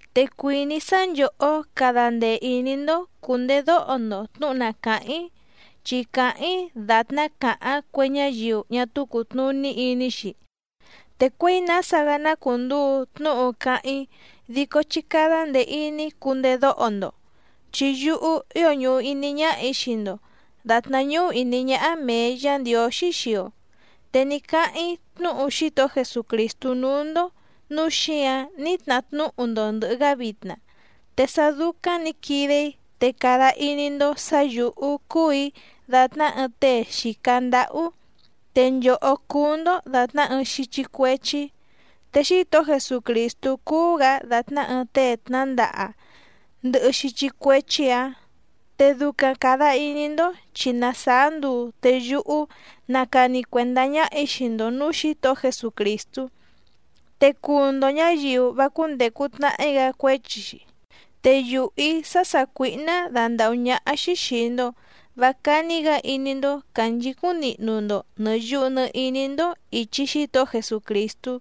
Te cuìní‑í sá nchòhó cada ndee ìní‑ndó cùndedóho‑ndo tnǔhu na càháⁿ‑í, chi cáháⁿ‑í dàtná càháⁿ cue ñáyiu ñá túú cùtnuní iní‑xi, te cuěi nása‑gá ná cùnduu tnúhu cáháⁿ‑í dico chí cádá ndèe iní cundedóho‑ndo. Chi yúhú ío ñùhu iní ñáhà‑í xii‑ndo dàtná ñúhú ìní ñáhá mèe Yá Ndiǒxí xii‑o, te ní cáháⁿ‑í tnúhu Xítohó Jesucrìstú núú‑ndó nǔu xíǎⁿ ní tnahá tnúhu‑ndo ndɨ̀hɨ‑gá vitna, te sá dúcáⁿ nǐ quide‑í te cada iní‑ndó sǎ yǔhú cúù‑í dàtná ɨɨⁿ tée xìca ndáhú te nchòhó cúú‑ndó dàtná ɨɨⁿ xíchí cuéchí, te Xítohó Jesucrìstú cúú‑gǎ dàtná ɨɨⁿ tée tnándaha ndɨhɨ xíchí cuéchí‑ǎⁿ. Te ducaⁿ càda iní‑ndó chi na sàá nduu te yúhú na càni cuendá ñáhà‑í xii‑ndo nǔú Xǐtohó Jesucrìstú, te cuu‑ndo ñǎyiu vá cúndècu tnahí‑gá cuéchi‑xi. Te yùhú‑í sá sàcuíhná dandàhú ñáhá‑xí xìi‑ndo vá cání‑gǎ iní‑ndó cànchicúⁿ nihnu‑ndo nɨ̀ yuhu nɨ iní‑ndó ìchi Xítohó Jesucrìstú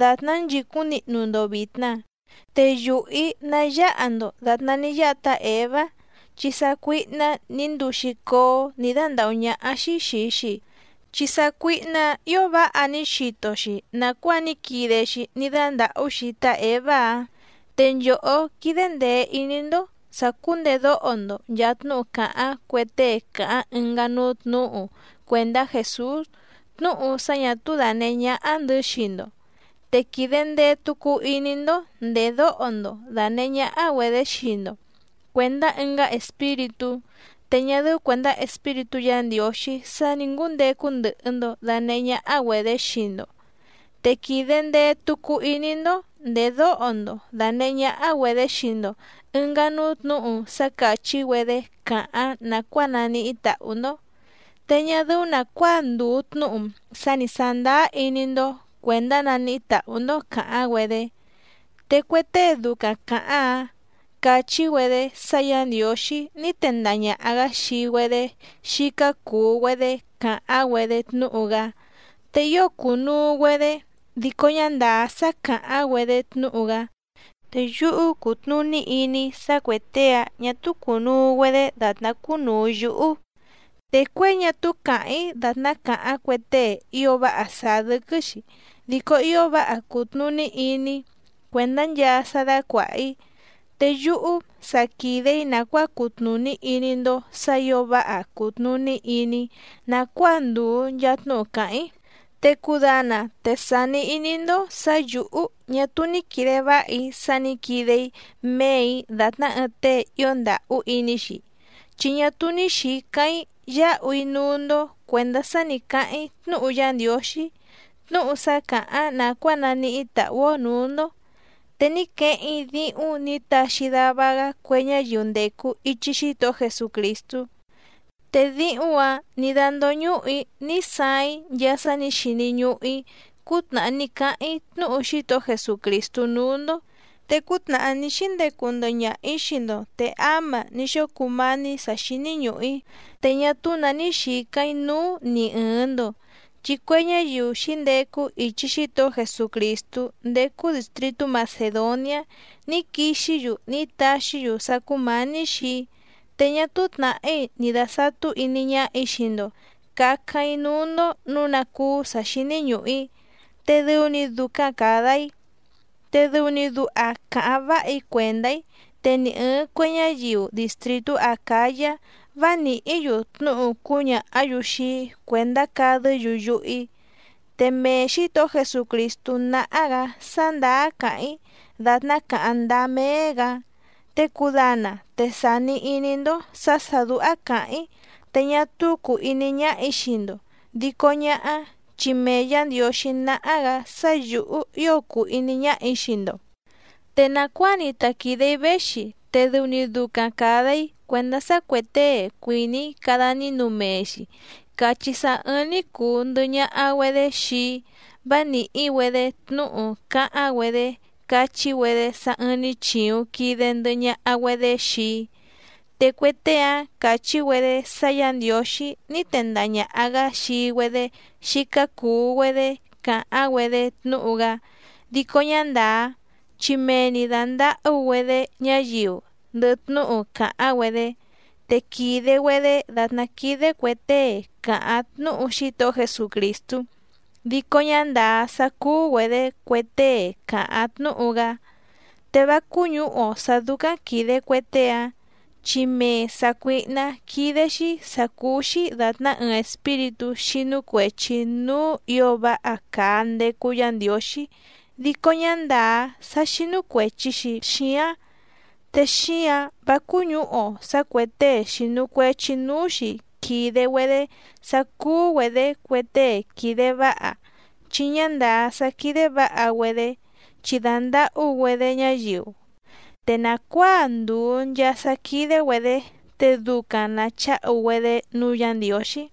dàtná nchìcúⁿ nihnu‑ndo vìtna. Te yùhú‑í ná yáha‑ndo dàtná ní yáha tá Èvá, chi sácuíhná nǐ nduu‑xi cóó nǐ dándàhú ñáhá‑xí xìi‑xi, chi sácuíhná‑ǎⁿ ǐo váha ní xito‑xi nàcuáa ní quide‑xi ní dándàhú‑xi tá Èvá‑áⁿ. Te nchòhó, quídé ndèe iní‑ndó sàcúndedóho‑ndo nchàa tnúhu càháⁿ cue tée càháⁿ ɨngá núú tnǔhu cuèndá Jèsús tnúhu sá ñà túú dànehé ñáhá‑ndɨ̌ xii‑ndo, te quìde ndee tucu iní‑ndó ndèdóho‑ndo dànehé ñáhá‑güedě xii‑ndo cuèndá ɨngá espíritú, te ñá dɨ́ú cuèndá Espíritú Yǎ Ndiǒxí sá nǐ ngúndecu ndɨhɨ‑ndo dànehé ñáhá‑güedě xii‑ndo, te quìde ndee tucu iní‑ndó ndèdóho‑ndo dànehé ñáhá‑güedě xii‑ndo ɨ̀ngá núú tnǔhu sá càchí‑güedé càháⁿ nàcuáa naníhí tàhú‑ndó, te ñá dɨ́ú nàcuáa ndùu tnúhu sá ni sàndáá iní‑ndó cuèndá naníhí tàhú‑ndó càháⁿ‑güedé. Te cue tée ducaⁿ càháⁿ‑áⁿ càchí‑güedé sá Yǎ Ndiǒxí ní tendaha ñàha‑gá xii‑güedé xícá cùu‑güedé càháⁿ‑güedé tnúhu‑gá te ío cùnuu‑güedé, dico ñá ndàá sá càháⁿ‑güedé tnúhu‑gá. Te yúhú cútnùní iní‑í sá cuè tée‑ǎⁿ ñá túú cùnuu‑güedé dàtná cúnùu yúhú. Te cuěi ñá túú càháⁿ‑í dàtná càháⁿ cue tée ío váha sàá dɨ́quɨ́‑xi dico ío váha cùtnuní iní‑í cuèndá nchaa sá dácuàha‑í, te yúhú sa quìde‑í nàcuáa cutnùní iní‑ndó sǎ ǐo váha cùtnuní iní‑í nàcuáa ndùu nchaa tnúhu càháⁿ‑í. Te cudana te sàni iní‑ndó sǎ yǔhú ñá túú ní quìde váha‑í sá nǐ quide‑í méè‑í dàtná ɨɨⁿ tée ío ndàhú iní‑xi, chi ñá túú ní xìcáⁿ‑í yáhu‑í núú‑ndó cuèndá sá nǐ cáháⁿ‑í tnúhu Yá Ndiǒxí tnúhu sá càháⁿ nàcuáa naníhí tàhú‑ó nǔú‑ndó. Te ní queheⁿ‑í díhúⁿ nǐ taxi dava‑gá cue ñáyiu ndècu ichi Xítohó Jesucrìstú, te díhúⁿ‑ǎⁿ nǐ dándóñùhu‑í ní saaⁿ‑í nchaa sá nǐ xini ñùhu‑í cútnàhá ní cáháⁿ‑í tnúhu Xítohó Jesucrìstú núú‑ndó. Te cútnàhá ní xíndecu ndɨhɨ ñaha‑ǐ xii‑ndo te áma ní xóo cumání sǎ xíní ñùhu‑í, te ñá túú nǎ ní xǐcáⁿ‑í núú ni ɨ̀ɨⁿ‑ndo. Chi cue ñáyiu xǐndecu ichi Xítohó Jesucrìstú ndécú dìstritú Macèdoniá ní quixí‑yu ní taxí‑yu sá cúmǎní xii‑í, te ñá túú tnàhí ni dàsatú iní ñáhà‑í xii‑ndo cǎcáⁿ‑í núú‑ndó nǔu ná cúú sǎ xíní ñùhu‑í, te dɨu‑ni ducaⁿ càda‑í. Te dɨu‑ni duha cáháⁿ váha‑í cuèndá‑í te ni ɨ̀ɨⁿ cue ñáyiu distrìtú Acǎyá vá nìhí‑yu tnúhu cúñàhá‑yu xii‑í cuèndá cadɨ́‑yu yuhu‑í. Te mee Xǐtohó Jesucrìstú náhá‑gǎ sá ndàá càháⁿ‑í dàtná càháⁿ ndáá méé‑gǎ. Te cudana te sàni iní‑ndó sǎ sà dúhá càháⁿ‑í te ñá túú cùu iní ñáhà‑í xii‑ndo, dico ñáhá chi mee Yǎ Ndiǒxí náhá‑gǎ sá yǔhú ío cùu iní ñáhà‑í xii‑ndo. Te nàcuáa‑ni ta quìde‑í véxi te dɨu‑ni ducaⁿ càda‑í cuèndá sá cuè tée cuìní cada nínu mee‑xi càchí sá ɨ̀ɨⁿ‑ni cuu ndɨhɨ ñaha‑güedé xii‑í vá nìhí‑güedé tnúhu cáháⁿ‑güedé cachí‑güedé sá ɨ̀ɨⁿ‑ni chiuⁿ quide ndɨhɨ ñaha‑güedé xii‑í. Te cue tée‑áⁿ càchí‑güedé sá Yǎ Ndiǒxí ní tendaha ñàha‑gá xii‑güedé xícá cùu‑güedé càháⁿ‑güedé tnúhu‑gá dico ñá ndàá, chi mee‑ni dàndahú‑güedé ñáyiu ndɨhɨ tnúhu càháⁿ‑güedé, te quìde‑güedé dàtná quídé cuè tée càháⁿ tnúhu Xítohó Jesucrìstú dico ñá ndàá sá cúú‑güedě cue tée càháⁿ tnúhu‑gá. Te vá cúñǔhu‑o sǎ dúcáⁿ quìde cue tée‑áⁿ, chi mee sàcuíhná quídé‑xí sǎ cúú‑xí dàtná ɨɨⁿ espíritú xínú cuèchi núú ǐo váha càa ndecu Yá Ndiǒxí dico ñá ndàá sá xínú cuèchi‑xi xíáⁿ. Te xíǎⁿ vá cúñǔhu‑o sǎ cuè tée xìnu cuechi núú‑xi quìde‑güedé sá cúú‑güedě cue tée quìde váha chi ñá ndàá sá quídé vǎha‑güedé chi dàndahú‑güedé ñáyiu. Te nàcuáa ndùu nchaa sá quídé‑güedě te ducaⁿ nàcháhu‑güedé núú Yǎ Ndiǒxí.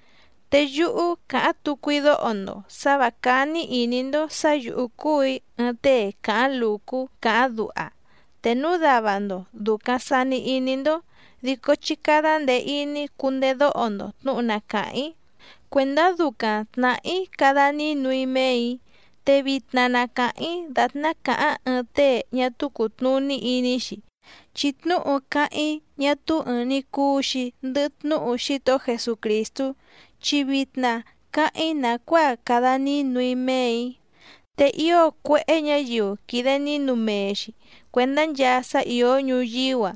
Te yúhú càháⁿ tucu‑í dóho‑ndo sǎ vǎ cání ìní‑ndó sǎ yǔhú cúù‑í ɨɨⁿ tée càháⁿ lùcú càháⁿ duha, te núu dava‑ndo dùcaⁿ sani iní‑ndó dico chí cádá ndèe iní cundedóho‑ndo tnǔhu na càháⁿ‑í cuèndá ducaⁿ tnàhá‑í cada nínu‑í méè‑í. Te vitna na càháⁿ‑í dàtná càháⁿ ɨɨⁿ tée ñá túú cùtnuní iní‑xi, chi tnúhu cáháⁿ‑í ñá túú ɨ̀ɨⁿ‑ni cuu‑xi ndɨhɨ tnúhu Xítohó Jesucrìstú, chi vitna cáháⁿ‑í nàcuáa cada nínu‑í méè‑í. Te ío cuéhé ñǎyiu quìde nínu mee‑xi cuèndá nchaa sá ìó ñuyíú‑a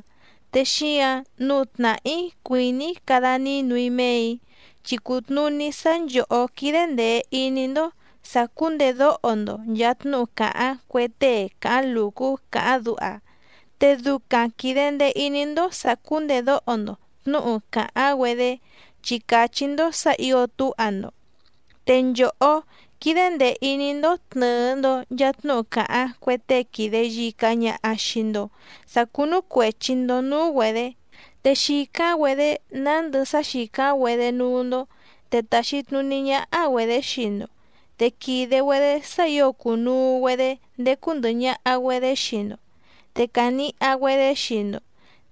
te xíǎⁿ nǔu tnàhá‑í cuìní‑í cada nínu‑í méè‑í. Chi cùtnuní sá nchòhó quídé ndèe iní‑ndó sàcúndedóho‑ndo nchàa tnúhu càháⁿ cue tée càháⁿ lùcú càháⁿ duha, te ducaⁿ quìde ndee iní‑ndó sàcúndedóho‑ndo tnǔhu càháⁿ‑güedé chi càchí‑ndó sǎ ǐo túha‑ndo. Te nchòhó, quìde ndee iní‑ndó tnɨ̀ɨ‑ndo nchaa tnúhu càháⁿ cue tée quìde yica ñaha xii‑ndo sá cúnú cuèchi‑ndo núú‑güedě, te xìcáⁿ‑güedé nándɨ sá xìcáⁿ‑güedé núú‑ndó, te tàxi tnuní ñáhá‑güedě xii‑ndo, te quìde‑güedé sá ǐo cùnuu‑güedé ndécú ndɨ̀hɨ ñaha‑güedé xii‑ndo, te càniha‑güedé xii‑ndo,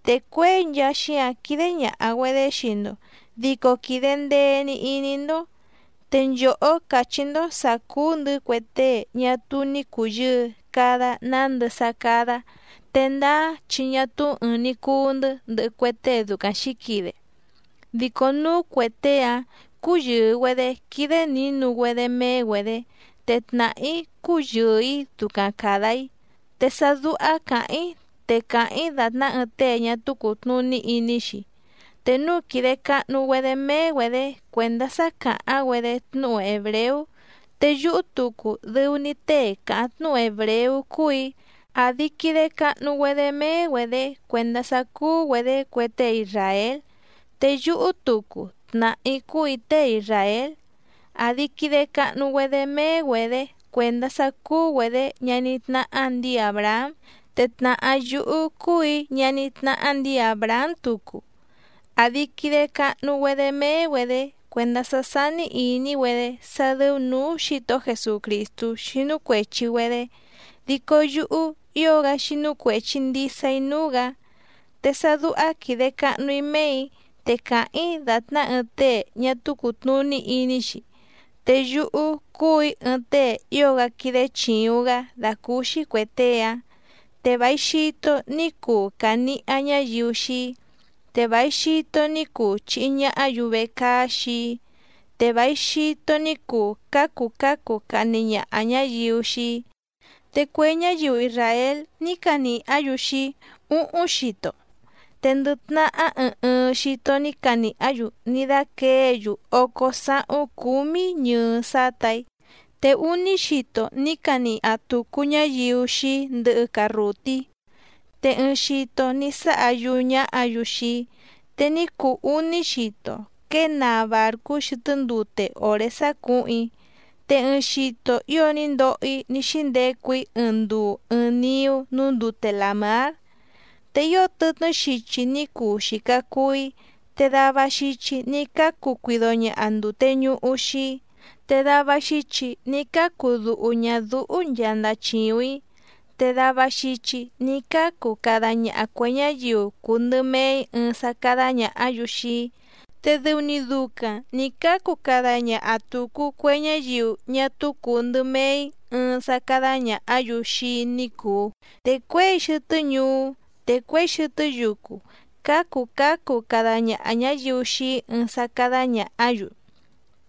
te cuěi nchaa xíǎⁿ quídé ñàha‑güedé xii‑ndo dico quìde ndee‑ni iní‑ndó. Te nchòhó càchí‑ndó sǎ cúú‑ndɨ̌ cue tée ñá túú ní cùyɨɨ cada nándɨ sá cádá, te ndáá chi ñá túú ɨ̀ɨⁿ‑ni cuu‑ndɨ́ ndɨhɨ cue tée ducaⁿ xǐquide. Dico núu cue tée‑áⁿ cúyɨ̀ɨ‑güedé quídé nǐnu‑güedé méé‑güedě, te tnàhá‑í cúyɨ̀ɨ‑í ducaⁿ càda‑í. Te sá dúhá càháⁿ‑í te càháⁿ‑í dàtná ɨɨⁿ tée ñá túú cùtnuní iní‑xi. Te núu quìde cahnu‑güedé méé‑güedě cuèndá sá càháⁿ‑güedé tnúhu hèbreú, te yúhú tucu dɨu‑ni tée càháⁿ tnúhu hèbreú cúù‑í, àdi quide cahnu‑güedé méé‑güedě cuèndá sá cúú‑güedě cue tée isràél, te yúhú tucu tnàhá‑í cúù‑í tée isràél, àdi quide cahnu‑güedé méé‑güedě cuèndá sá cúú‑güedě ñaní tnáhá ndǐi Àbrahám, te tnàhá yúhú cúù‑í ñaní tnáhá ndǐi Àbrahám tucu. Àdi quide cahnu‑güedé méé‑güedě cuèndá sá sání ìní‑güedé sá dɨ́ú nǔú Xǐtohó Jesucrìstú xínú cuèchi‑güedé, dico yúhú ío‑gá xínú cuèchi ndisa‑í núú‑gǎ. Te sá dúhá quìde cahnu‑í méè‑í te càháⁿ‑í dàtná ɨɨⁿ tée ñá túú cùtnuní iní‑xi, te yúhú cúù‑í ɨɨⁿ tée ío‑gá quídé chìuⁿ‑gá dàcúúxí cuè tée‑áⁿ, te vài xito ní cuu càniha ñáyiu xii‑í, te vài xito ní cuu chìhi ñahá‑yu vecaá xii‑í, te vài xito ní cuu cǎcu cǎcu cahni ñaha ñáyiu xii‑í. Te cue ñáyiu isràél ní canìhá‑yu xii‑í úhúⁿ xito, te ndɨ tnahá ɨɨⁿ ɨɨⁿ xito ní canìhá‑yu ní dáquěe‑yu ócó sáhúⁿ cúmí ñɨɨ sátà‑í. Te úní xito ní caniha tùcu ñáyiu xii‑í ndɨhɨ carrùtí, te ɨɨⁿ xito ní sáha yúú ñáhǎ‑yu xii‑í, te ní cuu úní xito quěe naa bàrcú xɨtɨ́ ndute òré sácǔhuⁿ‑í, te ɨɨⁿ xito ío ní ndoho‑í ní xíndecu‑í ɨɨⁿ nduu ɨɨⁿ niú núú ndute làmár. Te ío tɨtnɨ́ xichi ní cuu xìca cuu‑í, te dava xichi ní cácu cuido ñaha ndùte ñuhu xii‑í, te dava xichi ní cácu duhu ñàdúhú nchaa ndachìuⁿ‑í, te dava xichi ní cácu cada ñaha cuè ñáyiu cùu ndɨ mee‑í ɨɨⁿ sá cádá ñàhá‑yu xii‑í, te dɨu‑ni ducaⁿ nǐ cácu cada ñaha tùcu cue ñáyiu ñá túú cùu ndɨ mee‑í ɨɨⁿ sá cádá ñàhá‑yu xii‑í ní cùu, te cuěi xɨtɨ́ ñuú te cuěi xɨtɨ́ yucu cǎcu cǎcu cada ñaha ñǎyiu xii‑í ɨɨⁿ sá cádá ñàhá‑yu,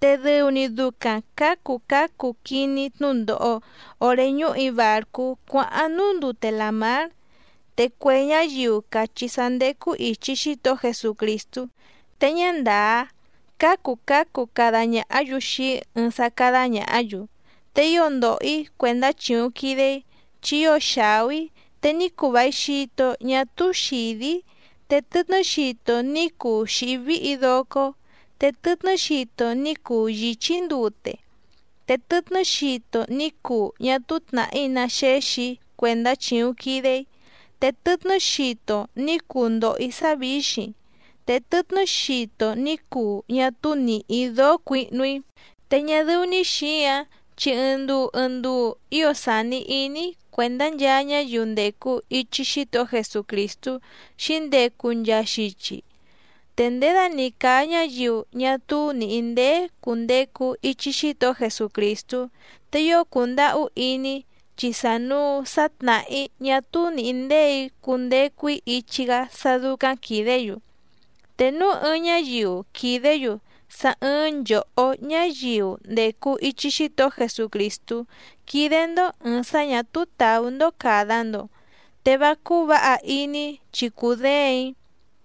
te dɨu‑ni ducaⁿ cǎcu cǎcu quiní‑í tnúndòho oré ñúhù‑í bàrcú cuáháⁿ núú ndute làmár. Te cue ñáyiu càchí sá ndécú ìchi Xítohó Jesucrìstú te ñá ndàá cǎcu cǎcu cada ñàhá‑yu xii‑í ɨɨⁿ sá cádá ñàhá‑yu. Te ío ndòho‑í cuèndá chìuⁿ quide‑í chi ío xàú‑í, te ní cuu vài xito ñá túú xìdí‑í, te tɨtnɨ́ xito ní cuu xìhí víhì‑í docó, te tɨtnɨ́ xito ní cuu yìchí‑í ndute, te tɨtnɨ́ xito ní cuu ñá túú tnàhí ná xéxì‑í cuèndá chìuⁿ quide‑í, te tɨtnɨ́ xito ní cuu ndòho‑í sá vǐxiⁿ, te tɨtnɨ́ xito ní cuu ñá túú nìhí‑í dóó cuihnu‑í. Te ñá dɨ́ú‑ní xǐǎⁿ chi ɨɨⁿ nduu ɨɨⁿ nduu ío sàni iní‑í cuèndá nchaa ñáyiu ndècu ichi Xítohó Jesucrìstú xǐndecu nchaa xichi. Te nděda‑ni càa ñáyiu ñá túú nìhí ndéé cùndecu ichi Xítohó Jesucrìstú, te ío cùndahú iní‑í chi sànuu sá tnàhá‑í ñá túú nìhí ndéè‑í cundecu‑í ichi‑gá sá dúcáⁿ quìdé‑yu. Te núu ɨɨⁿ ñáyiu quìdé‑yu sá ɨ̀ɨⁿ nchohó ñáyiu ndècu ichi Xítohó Jesucrìstú quídé‑ndó ɨ̀ɨⁿ sá ñà túú tàú‑ndó càda‑ndo te vá cúú vǎha iní‑í chi cudéèⁿ‑í.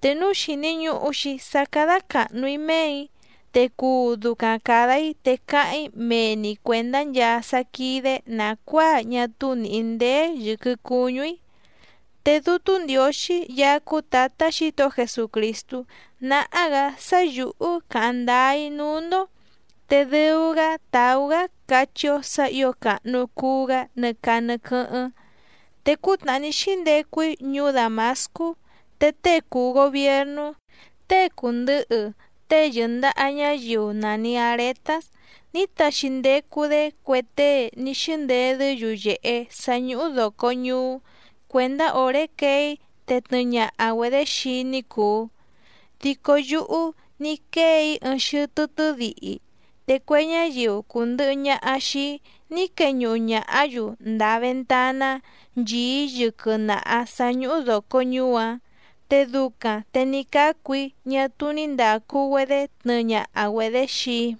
Te núu xìni ñuhu‑xi sá cádá càhnu‑í méè‑í, te cuu ducaⁿ càda‑í te cáháⁿ‑í mee‑ni cuèndá nchaa sá quídé nàcuáa ñá túú nìhí ndéé yɨ̀quɨ cuñú‑í. Te Dútú Ndiǒxí Yaá cúú Tǎtá Xǐtohó Jesucrìstú náhá‑gǎ sá yǔhú càháⁿ ndáá‑í núú‑ndó, te dɨu‑gá tàú‑gá cachí‑ó sǎ ǐo càhnu cuu‑gá nɨ caa nɨ quɨ́hɨ́ⁿ. Te cútnàhá ní xíndecu‑í ñuú Dàmascú te tée cùu gobiernú tée cùndɨhɨ tée yɨ̀ndaha ñáyiu nàni Aretás ní taxi ndecu‑dé cue tée ní xíndedɨ́ yuyèhe sá ñúhú dòco ñuú cuèndá òré quee‑í te tnɨɨ ñaha‑güedě xii‑í ní cùu. Dico yúhú ní quéè‑í ɨɨⁿ xɨtɨ́ tɨ́dihi, te cue ñáyiu cùndɨhɨ ñaha xii‑í ní queñuhu ñàhá‑yu ndàa ventaná nchìí yɨquɨ naha sǎ ñúhú dòco ñuú‑áⁿ, te ducaⁿ te ní cácu‑í ñá túú ní ndàcu‑güedé tnɨɨ ñaha‑güedě xii‑í.